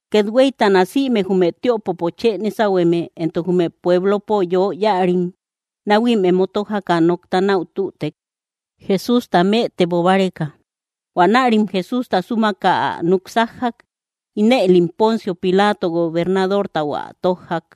Kethueytana, sïme jume tïopopo chë nésahueme entok jume pueblopo yö yáarim, náhuim emo tójaka nokta náu tütek, Jesústa mëtebo báreka. Huanärim Jesústa súmaka ä núk sájjak; ínëlim Poncio Pilato gobernadortau ä tójjak.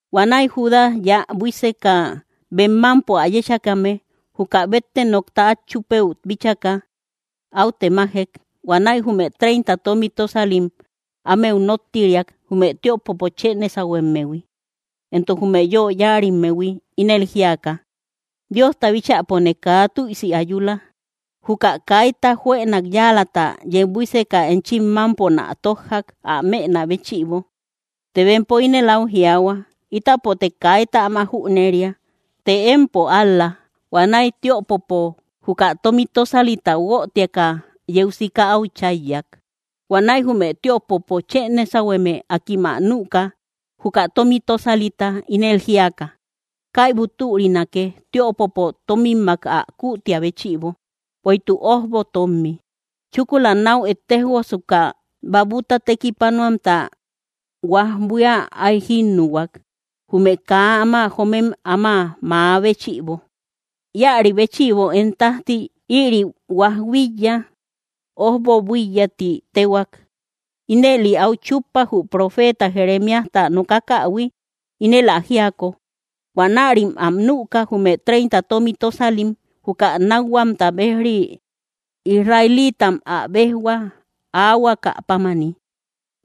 Huanäi Judas, yä buíseka bem mámpo ä yéchakame, juka bétte nokta át chúpëu bíchaka, áu temajek. Huanäi jume treinta tómi tósalim ámeu nóttiriak, jume tïopopo chë nésahuemmehui, entok jume yö yáarimmehui, ínel jíaka: —Diosta bíchäpone kaa tüisi ayula. Juka kaita juënak yáalata yeu buíseka enchim mámponä tójjak, ä mënä béchïbo. Të bempo ínel áu jiaahua: —Ítapote kaita áma jüneria; të, ¡empo ál‑la! Huanäi tiöpopo juka tómi tósalita guötiaka, yeu sika áu cháyyak. Huanäi jume tiöpopo chë nésahueme, akim ä nüka, juka tómi tösalita, ínel jíaka: —Kaibu türinake, tiöpopo tómimak ä kuutia béchïbo, bueïtuk ójbo tómmi. Chúkula náu ettejosuka, babuta tekipanuamta huaj buía áy jínnuhuak, jume kaa áma joomem áma mäa béchïbo. Íäri béchïbo én tájti ïri huaj buíya, “Ójbo Buíya”, ti téhuak. Ínëli áu chúppa, jü profeeta Jeremíajta nokakähui, ínel ä jíako: “Huanärim am nüka, jume treinta tómi tósalim (juka nákhuamta béj‑ri, israeliitam ä béjhua aahuaka pámani).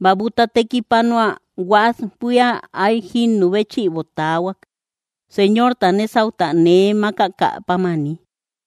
Babuta tekipanua huaj buía áy jínnu béchïbo taahuak, Señorta nésauta nee mákakä pámani.”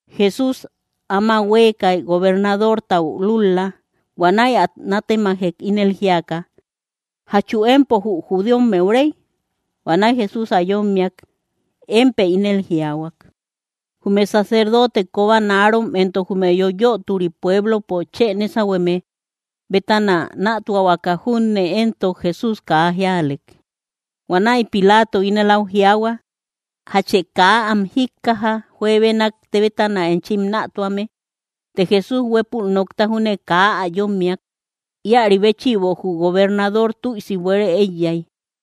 Jesús áma huéekay, gobernadortau lúl‑la. Huanäi ä nátemajek, ínel jíaka: —¿Jachu empo jü judíommeu réy? Huanäi Jesús ä yómmiak: —Émpë ínel jiaahua. Jume sacerdotem kobanarom entok jume yöyoturi pueblopo chë nesahueme bétana nätuahuaka junne, entok Jesús kaa jíalek. Huanäi Pilato ínel au jiaahua: —¿Jachë kaa am jíkkaja, juebenak bétana enchi nätuame? Të Jesús huépul nokta júne kaa ä yómmiak. Íäri béchïbo jü gobernador tüisi buére éiyay.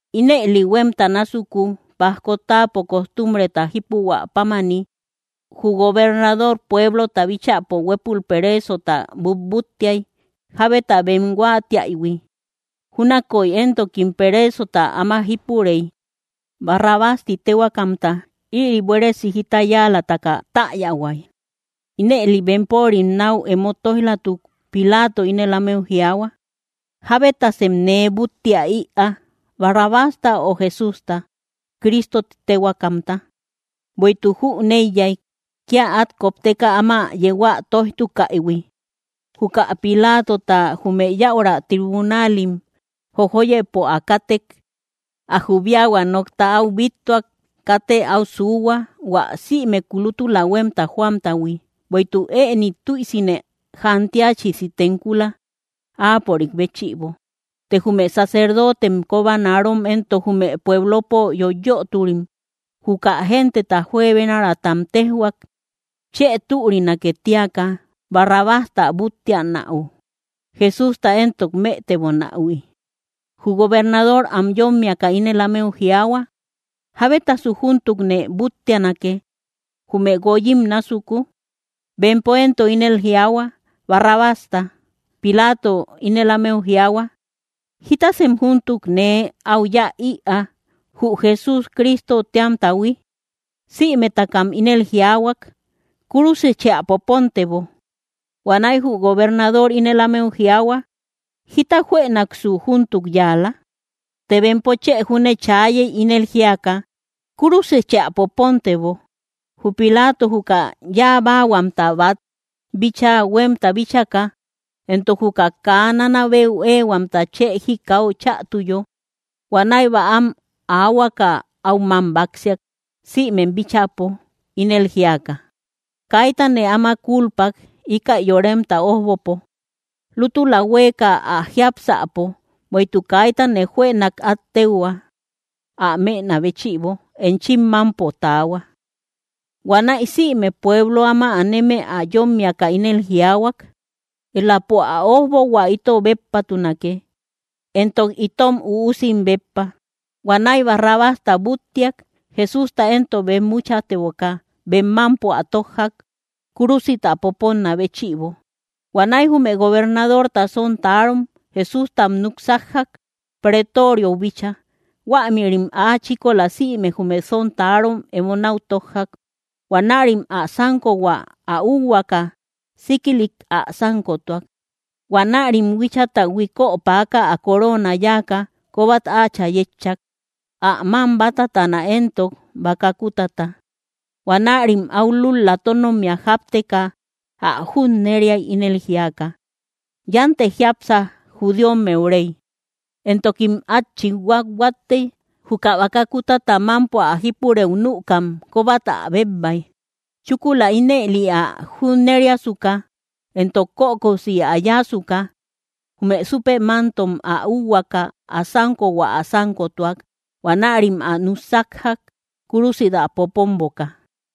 Ínëli huémta násuku, pajko táapo costumbreta jípuhuä pámani, jü gobernador pueblota bíchäpo huépul pereesota butbúttiay, jábeta bem huáatiaïhui. Júnakoy éntokim pereesota áma jípurey, Barrabás ti téhuaakamta; ïri buéresi jita yáalataka täyahuay. Ínëli bempörim náu emo tóij‑latuk, Pilato ínel ámeu jiaahua: —¿Jábetasem nee búttia ïaa: Barrabásta, ö Jesústa, Cristo ti téhuaakamta? Bueïtuk jüneiyay, kía át kopteka áma yeu ä tóijtukaïhui. Juka Pilatota, jume yäura tribunalim jojoyëpo ä kátek, ä jubiahua nokta áu bíttuak: “Katë áu suuhua, hua sïmeku lútula huémta joamtahui, bueïtuk ëni tüisine jantiachisi tenkula, áapörik béchïbo.” Të jume sacerdotem kobanarom entok jume pueblopo yöyoturim, juka gente juebenaratam téjhuak, chë türinake tíaka, Barrabásta búttianäu, Jesústa éntok mëtebonähui. Jü gobernador am yómmiaka ínel ámeu jiaahua: —¿Jábetasu júntukne búttianake, jume guoyim násuku? Bempo éntok ínel jiaahua: —Barrabásta. Pilato ínel ámeu jiaahua: —¿Jítasem júntuk nee áu yáa ïa, jü Jesús Cristo téamtahui? Sïmetakam ínel jiaahuak: —¡Kúrusichë ä popontebo! Huanäi jü gobernador ínel ámeu jiaahua: —¿Jíta juënaksu júntuk yáala? Të bempo chë júne chaayey, ínel jíaka: —¡Kúrusichë ä popontebo! Jü Pilato juka yáa báahuamta bát bíchaa huémta bíchaka, entok juka kaa nanabeu éehuamta chë jikau chätuyo, huanäi bäam aahuaka áu mám báksiak sïmem bíchäpo, ínel jíaka: —Kaitane áma kúlpak, íkäi yoremta ójbopo lútula huéeka ä jiápsäpo, bueïtuk kaitane juënak át téuhua, ä mënä béchïbo. Enchim mámpo taahua. Huanäi sïme pueblo áma aneme ä yómmiaka, ínel jiaahuak: —Éläpo ä ójbohua ito béppatunake, entok itom üusim béppa. Huanäi Barrabásta búttiak. Jesústa éntok bemmuchateboka, bem mámpo ä tójjak, kúrusit ä poponnä béchïbo. Huanäi jume gobernadorta sontarom, Jesústam núk sájjak, Pretoriou bíchaa. Huämïrim áa chíkola sïme jume sontarom emo náu tójjak. Huanarïm ä sánkohua ä úuhuaka, síkilik ä sánkotuak. Huanärim huíchata huikö päaka ä coroona yáaka kóbat áachä yétchak, ä mám bátatana éntok baka kútata. Huanärim áu lúl‑la tónommia jápteka, ä junneriay, ínel jíaka: —¡Yántë jiápsa, judíommeu réy! Entokim át chit huathuattey, juka baka kútata mámpo ä jípurëu nükam, kóbat ä bébbay. Chúkula ínëli ä junneriasuka, entok kökosi ä yáasuka, jume súpe mántom ä úuhuaka, ä sánkohua ä sánkotuak. Huanärim ä núk sájjak, kúrusit ä poponboka.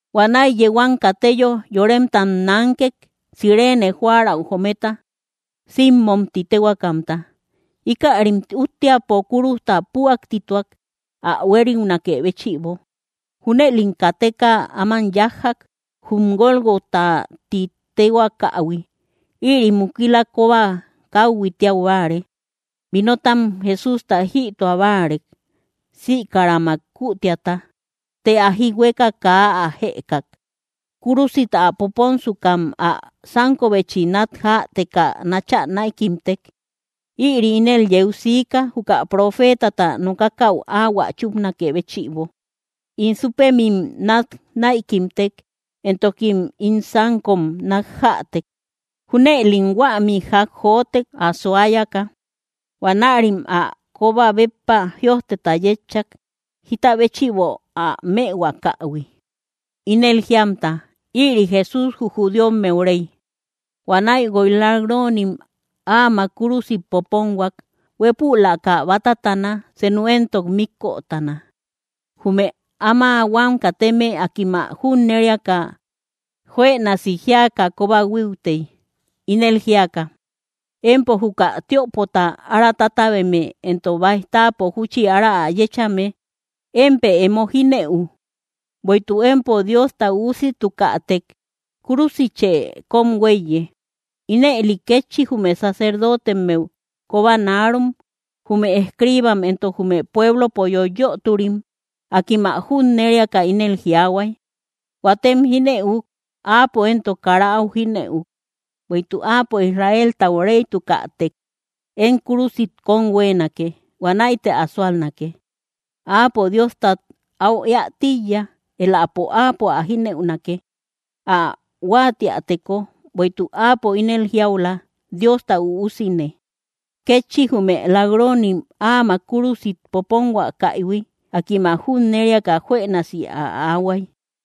Huanäi yeu am kateyo, yoremtam nánkek, Cirene jóärau joometa, Simmom ti téhuaakamta. Íkärim úttiapo kúrujta püaktituak, ä huériunakë béchïbo. Júnëlim kateka áman yájjak, jum Gólgota ti téhuaakähui. Ïri “Mukila Kóba Káuhui”, tiau báare. Vinotam Jesústa jïtua báarek, sïkaramak kütiata; të ä jihueka kaa ä jëkak. Kúrusit ä poponsukam ä sánkobechi nat jäteka náchä näikimtek. Ïri ínel yeu siika, juka profeetata nokakäu áhuä chúpanakë béchïbo: “In súpemim nat näikimtek, entokim ín sánkom nat jätek.” Júnëlim huämi ják jotek, ä suayaka. Huanärim ä kóba béppa jïojteta yétchak, jita béchïbo ä mëhuakahui, ínel jíamta: “Ïri Jesús jü judíommeu réy.” Huanäi guoy lak‑ronim áamak kúrusit poponhuak, huépülaka bátatana, senu éntok míkötana. Jume áma huam kateme, akim ä junneriaka juënasi jíaka kóba huíutey, ínel jíaka: —Empo juka tiöpota ára tátabeme entok báij táapo júchi ára ä yéchame, ¡émpë emo jínëu! Bueïtuk empo Diosta Üusitukätek, ¡kúrusitche kóm huéiye! Ínëli kétchi jume sacerdotemmeu kobanarom, jume escriibam entok jume pueblopo yöyoturim, akim ä junneriaka ínel jiaahuay: —Huatem jínëuk; ¡áapo éntok kara áu jínëu! Bueïtuk áapo Israeltau réytukätek, ¡én kúrusit kón huéenake! Huanäite ä súalnake. Áapo Diostat áu éä tíiya; éläpo áapo ä jínëunake, ä huáatiäteko; bueïtuk áapo ínel jiaula, “Diosta Üusine”. Kétchi jume lak‑ronim, áamak kúrusit popontukaïhui, akim ä junneriaka juënasi ä aahuay.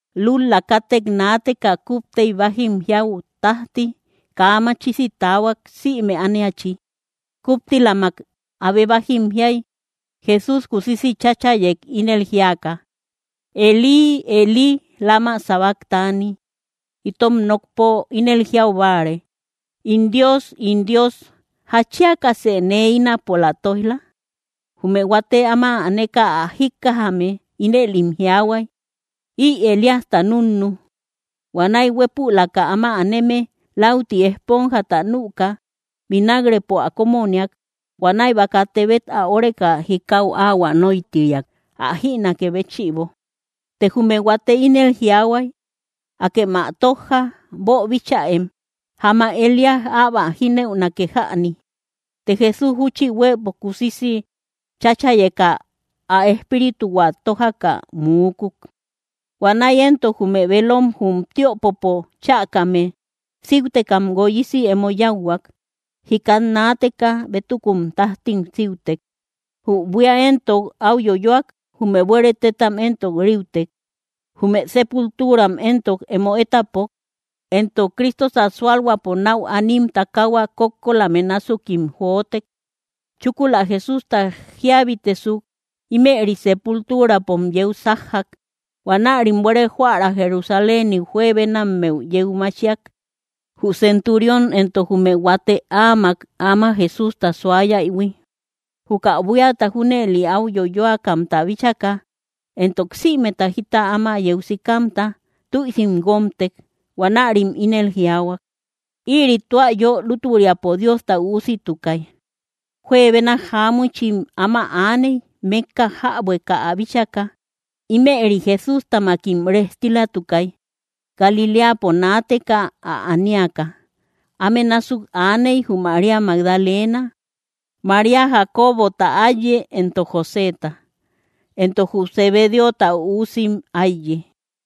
Lúl‑la kátek naateka, kúptey bájim jiau tájti kaa machisi taahuak, sïme ániachi. Kuptilamak abe bájim jiay, Jesús kusisi cháchayek, ínel jíaka: —Elí, Elí, ¿lama sabactani? —itom nokpo ínel jiau báare: In Dios, ín Dios, ¿jatchiakasë nee ínapola tóij‑la? Jume huate áma aneka ä jíkkajame, ínëlim jiaahuay: —Ï Elíasta núnnu. Huanäi huépülaka áma aneme läuti ejponjata nüka, vinak‑repo ä kómoniak. Huanäi baka tebet ä óreka, jikau áhuä nóitiriak ä jïnakë béchïbo. Të jume huate ínel jiaahuay: —Akem ä tójja. Boobichäem; jamak Elías äbo ä jínëunake jäni. Të Jesús júchi huëpo kusisi cháchayeka, ä espírituhua tójaka muukuk. Huanäi éntok jume velom jum tiöpopo chäkame síutekam guoyisi emo yáuhuak; jikat naateka bétukun tájtim síutek. Jü buía éntok áu yoyoak; jume buere tétam éntok riutek. Jume sepulturam éntok emo étapok, entok Cristota sualhuäpo nau anim takahua kókkolame násukim jotek. Chúkula Jesústa jíabitesuk, ímëri sepulturapom yeu sájjak. Huanärim buére jóära Jerusaléniu juebenammeu yeu machiak. Jü centurión entok jume huate áamak áma Jesústa suayaïhui, juka buíata junëli áu yoyoakamta bíchaka, entok sïmeta jita áma yeu sikamta, tüisim guómtek. Huanärim ínel jiaahua: —¡Ïri tua yö lútüriapo Diosta Üusitukay! Juebena jáamuchim áma aaney, mékka jäbueka ä bíchaka. Ímëri Jesústamakim rejtilatukay, Galiléapo naateka ä aniaka. Áme násuk aaney jü María Magdalena, María Jacobota áiye entok Joseta, entok jü Zebedeota üusim áiye.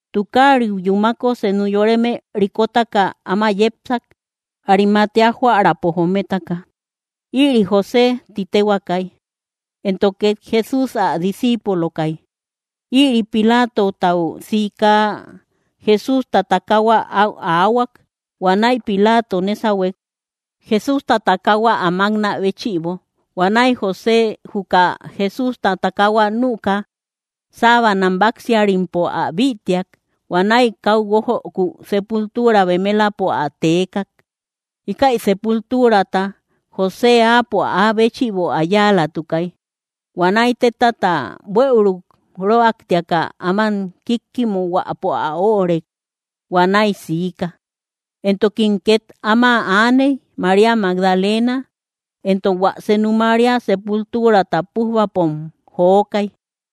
Tukariu yúmako, senu yoreme rikotaka áma yepsak, Arimatea jóärapo jometaka. Ïri José ti téhuaakay, entok két Jesús ä discíipulokay. Ïri Pilatotau sika, Jesústa takaahua áu aahuak. Huanäi Pilato nésahuek, Jesústa takaahua ä máknä béchïbo. Huanäi José juka Jesústa takaahua nüka, sábanam báksiarimpo ä bïtiak. Huanäi káu guójöku sepultura bemelapo ä teekak. Íkäi sepulturata José áapo áa béchïbo ä yáalatukay. Huanäi tétata buëuruk röaktiaka áman kíkkimuhuäpo ä óorek. Huanäi siika. Entokim két áma aaney, María Magdalena entok hua senu María; sepulturata pújbapom jokay.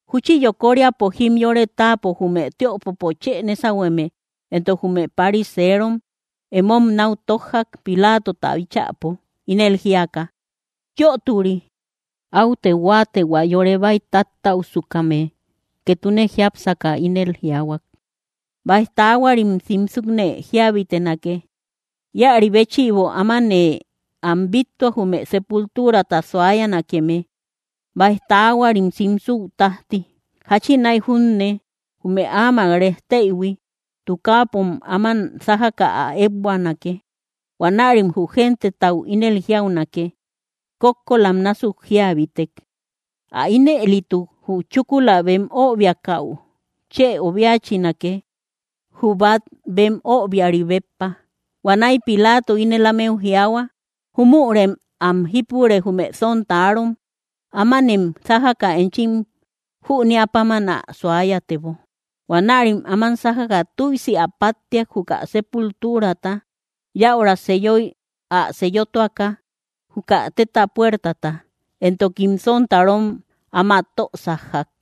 Júchi yokoríapo jimyore táapo, jume tiöpopo chë nésahueme entok jume pariserom emom náu tójjak, Pilatota bíchäpo, ínel jíaka: —Yöturi, áute huáate, hua yore baïtáttäusukame ketune jiápsaka ínel jiaahuak: “Báij taahuarim simsukne jíabitenake.” Íäri béchïbo amanë am bíttua, jume sepulturata suayanakeme báij taahuarim simsuu tájti. Jáchinay junne jume áamak rejteïhui tukaapom áman sájaka ä ékbuanake. Huanärim jü gentetau ínel jiaunake: “Kókkolam násuk jíabitek.” Ä ínëlituk, jü chúkula bem öbiakäu chë obiachinake, jü bát bem öbiari béppa. Huanäi Pilato ínel ámeu jiaahua: —Júmürem am jípure, jume sontarom. Ámanem sájaka enchim jüneä páman ä suayatebo. Huanärim áman sájaka tüisi ä páttiak, juka sepulturata, yäura seyoy ä seyotuaka, juka téta puertata; entokim sontarom áma tö sájjak.